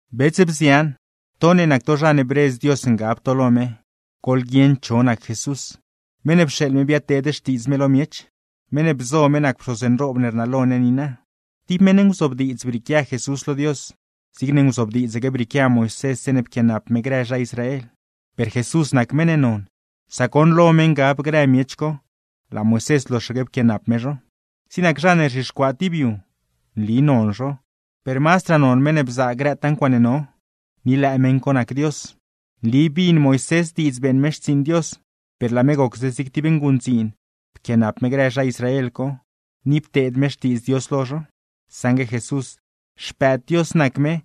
Bets, bzian, to ne nac to zha ne bredz Dios ngab to lo me; goḻguieṉ cho nac Jesús, meṉ ne pxeeḻ me biadteed xtiidz me lo miech, meṉ ne bzo me nac pxoz nroob ne rnalo ne niina. Tib meṉ nguzobdiidz brieequia Jesús lo Dios, zigne nguzobdiidzaque brieequia Moisés zeeṉe pquianap me grë zha Israel. Per Jesús nac meṉ ne non, sac goṉ lo me ngab grë miech co, laa Moisés loxaque pquianap me zho. Zig nac zha ne rzhixcuaa tib yu, nli non zho, per mazdraa non meṉ ne bzaa grëtaa ncuaaṉe no; ni lëë meṉ co nac Dios. Nli bin Moisés diidz beeṉ me xtsiiṉ Dios, per laa me gocse zig tib nguṉdziin pquianap me grë zha Israel co, ni pteed me xtiidz Dios lo zho. Saṉgue Jesús, Xpëëd Dios nac me,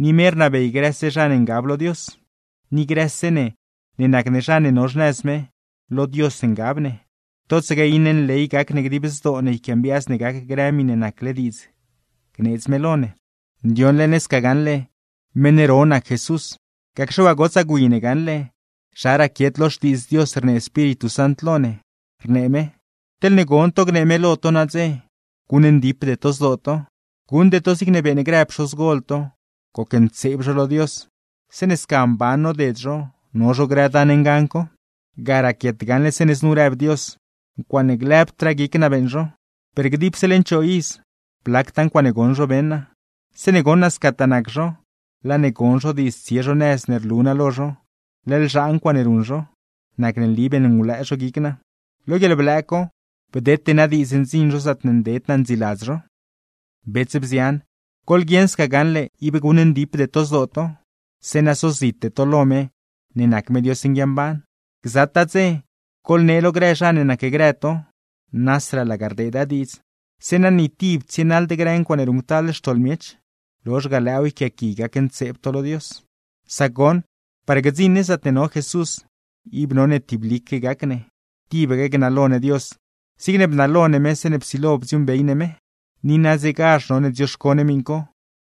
ni me rnabey grëse zha ne ngab lo Dios. Ni grëse ne, ne nac ne zha ne no xnëz me, lo Dios ngab ne; totsaque iṉe nley gac ne dib zdoo ne yquiambiaaz ne gac grë miṉe nacle diidz gneedz me lo ne. Ndioṉle ne sca gaṉle, meṉ ro nac Jesús, gacxe waa gotsaa gwi ne gaṉle zha raquiet lo Xtiidz Dios rnee Espíritu Sant lo ne, rnee me: Teḻne gon to gnee me lo to nadze, guṉndipde to zdoo to, guṉde to zigne beeṉ grë pxozgol to, gocntseeb zho lo Dios, zeeṉe sca mban noded zho, no zho grë dan ngan co. Ga raquiet gaṉle zeeṉe znu rëb Dios: Ncuaaṉe lëbdraa guic naa beeṉ zho, per dipse leṉ choo iz, blactaa ncuaaṉe goṉ zho beṉ naa. Zeeṉe goṉ naa scataa nac zho, laa ne gon zho diidz tsie zho nëz ne rlu naa lo zho, leḻ zhaa ncuaaṉe ruṉ zho; nacne nli beṉngulëë zho guic naa. Lo guieḻblëë co, bdete naa diidz ndziṉ zho zaatne nded naa ndziiladz zho. Bets, bzian, goḻguieṉ sca gaṉle ib guṉndipde to zdoo to, zeeṉa sozite to lo me ne nac me Dios nguiamban. Gzataa dze, goḻnee lo grë zha ne nacgrë to (nasraa laga rdeeda diidz), zeeṉa ni tib tsienaḻd grë ncuaaṉe ruṉctal xtoḻ miech, lozh ga lëëw yquiaaqui gacntseeb to lo Dios. Sac goṉ, par gdziṉ ne zaatne no Jesús, ib none tiblique gac ne, tibaque gnalo ne Dios zigne bnalo ne me zeeṉe psilo bdziuuṉbey ne me. Ni nadzegazh none dzioxco ne miṉ co.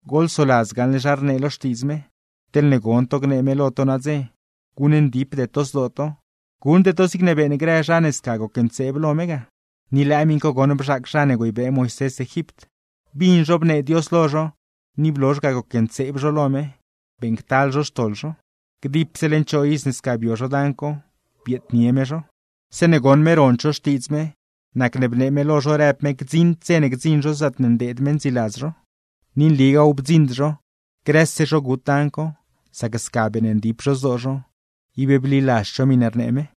Goḻsoladz gaṉle zha rnee lo Xtiidz me: Teḻne gon to gnee me lo to nadze, guṉndipde to zdoo to, guṉde to zigne beeṉ grë zha ne sca gocntseeb lo me ga. Ni lëë miṉ co goṉ bzhaac zha ne güeybee Moisés Egipt. Bin zho bnee Dios lo zho ni blozh ga gocntseeb zho lo me, beeṉctal zho xtoḻ zho. Dipse leṉ choo iz ne sca bio zho dan co, bieednie me zho. Zeeṉe goṉ me rond zho xtiidz me, nacne bnee me lo zho rëb me gdziṉd dze ne gdziṉ zho zaatne ndeed me ndziiladz zho. Ni nligaaw bdziṉd zho, grëse zho gut dan co; sac sca beeṉndip zho zdoo zho, ib bliladzd zho miṉe rnee me.